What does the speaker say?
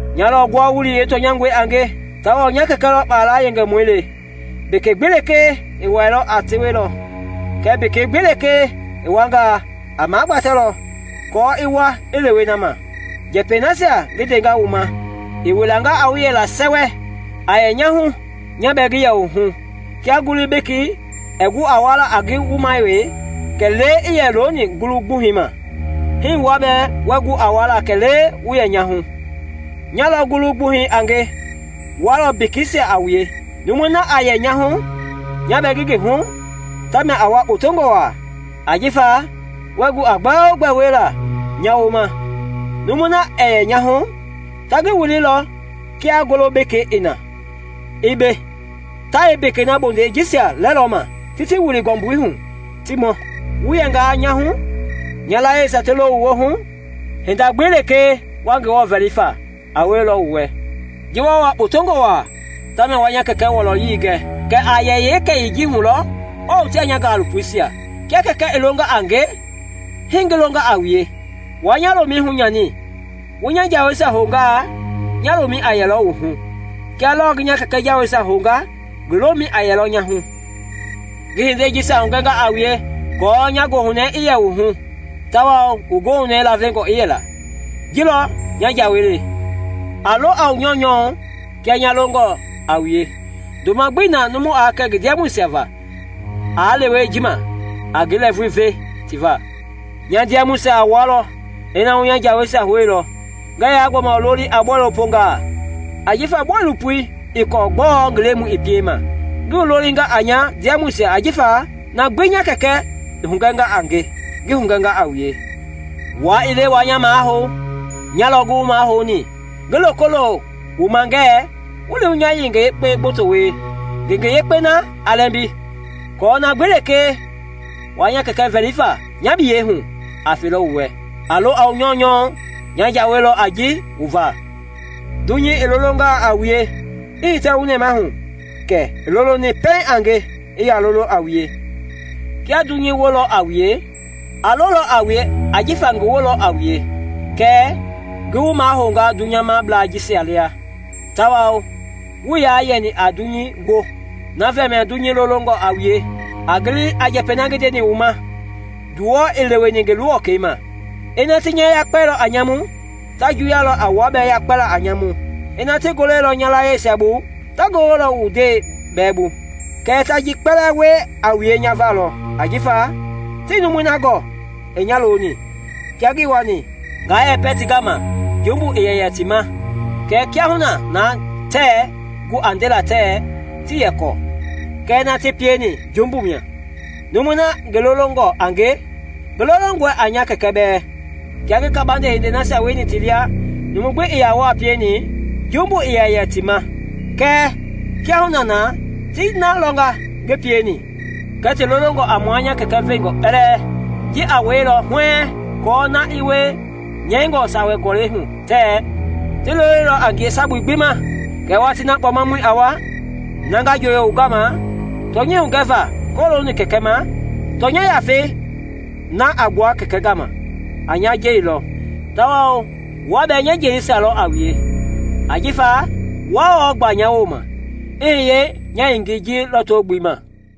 “Nya lɔ ngua-wulii yeetɔnyangɔi a nge, tawao nya Kɛkɛ lɔ kpala yengemɔi le. Mbeke gbi lekee ii wɛilɔ, a tewelɔ, kɛɛ mbeke gbi lekee i wuangaa, a magbatɛlɔ aako i wua i lewe na ma. Njɛpɛi nasia ngi ndenga wu ma i wilanga a wu yɛla sɛwɛ. A yɛ nya hu, nya bɛɛ ngi wu hu. Kia ngulu bekei ɛɛ gu a wuala a ngi wuma wee, kɛlee i yɛ looni ngulu gbuhɛi ma, hii wua bɛɛ wɛɛ gu a wuala kɛlee wu yɛ nya hu. “Nya lɔ ngulu gbuhɛi a nge, wua lɔ mbekeisia a wue. Numui na a yɛ nya hu, nya bɛɛ ngi ngi hu, tamia a wua kpotongɔ waa, ajifa wuɛɛ gu a gbɛogbɛ wiela nya wooma. Numui na ɛɛ yɛ nya hu, ta ngi wililɔ kia ngulu beke i na, i be; ta yeembeke bondei jisia lɛlɔ ma, ti ti wili ngɔmbui hu, ti mɔ. Wu yɛngaa nya hu, nya layiesia ti lo wu hu, hinda gbi lɛkee wa Ngewɔ vɛli fa a wielɔ wu wɛ. Ji wa wua kpotongɔ waa ta mia a nya Kɛkɛ wɔlɔyei gɛ, kɛ a yee kɛyii ji hulɔ wa wotea nya ngalopoisia. Kia Kɛkɛi i longa a nge, hii ngi longa a wue; wuaa nya lomɛi hunyani. Wu nya jaweisia houngaa, nya lomɛi a yɛlɔ wu hu, kia lɔɔ ngi nya Kɛkɛi jaweisia hounga, ngi lomɛi a yɛ nya hu. “Ngi hindei jisia hugɛnga a wue aako nya goohunɛɛi i yɛ wu hu tawao wu goohunɛɛi lavengɔ i yɛla. Ji lɔ nya jawei le: a lo a wu nyɔunyɔ kia nya longɔ a wue. Ndoma gbi ii na numu aa kɛ ngi ndiamɔisia va aa lewe ji ma a ngi lɛɛvui ve ti va. Nya ndiamɔisia a wua lɔ ina wu nya jaweisia houilɔ. Ngɛɛ yaa gbɔma wu loli a bɔilopongaa, ajifa bɔilopoi ii kɔɔ gbɔɔ ngi lemɔi i piema; ngi wu lolinga a nya ndiamɔisia ajifa na gbi nya Kɛkɛ i hugɛnga a nge, ngi hugɛnga a wue. Wua ii le wua nya mahou; nya lɔ ngi wu mahouni, ngi loko lo wu ma ngɛɛ wu li wu ngenge yekpe gboto wie, ngenge yekpei na a lɛmbi; aako na gbi lekee wa Kɛkɛi vɛli fa nya biyɛi hu, i fe wu wɛ. A lo a wu nyɔunyɔ; nya jawei lɔ a ji wu va. “Dunyei i lolongaa a wue, i hitɛ wu nɛmahu kɛ i loloni pɛiŋ a nge i yaa lolo a wue. Kiaa dunyei wolɔ a wue, aa lolɔ a wue jifa ngi woo lɔ a wue. Kɛɛ ngi wu mahouilɔ dunyablei jisia lia, tawao wuii yaa yɛni a dunyei woo, na va mia dunyei lolongɔ a wue. A gili a njɛpɛi na ngi ndeni wu ma: ‘Nduwɔi ii leweni ngi luwɔkɛi ma.’ Ina ti nya yakpɛilɔ a nyamu, ta juwuyalɔ a wua bɛɛ yakpɛla a nyamu; ina ti goleilɔ nya layieisia bu, ta gololɔ wu ndɛi bɛɛ bu. Kɛɛ ta ji kpɛlɛɛ wie a wue nya va lɔ, ajifa tii numui na gɔɔ i nya loni. Kiaa ngii wani nga yɛpɛ ti gama, jumbu ii yɛ yɛ ti ma; kɛɛ kiahuna na tɛɛ gu a ndela tɛɛ tii yɛ kɔɔ kɛ na ti pieni jumbu mia. Numui na ngi lolongɔ a nge, ngi lolongɔe a nya Kɛkɛ bɛɛ. Kiaa ngii kabande hindei nasia wieni ti lia numu weka gbi ii yaa wɔɔ pieni, jumbu ii yɛ yɛ ti ma; kɛɛ kiahuna na, ti na lɔnga ngi pieni kɛɛ ti lolonga a mua nya Kɛkɛ veenjɔɔ kpɛlɛɛ. Ji aa wielɔ huɛɛŋ aako na i wie nyɛingɔ Sawa Gɔlɛi hu tɛɛ, ‘Ti loloilɔ a nge sabu gbii ma.’ “Kɛɛ watii na Kpɔmamɔi a wa, na nga njooyo wu gama tɔnyɛi hugɛva kɔlooni Kɛkɛi ma, tɔnya Yafei na a gbua Kɛkɛi gama, a nya jelilɔ; tawao wua bɛɛ nya jelisia lɔ a wue ajifa wuaa wɔɔ gba nya wooma i hiye nya yengei ji lɔto-gbelei ma.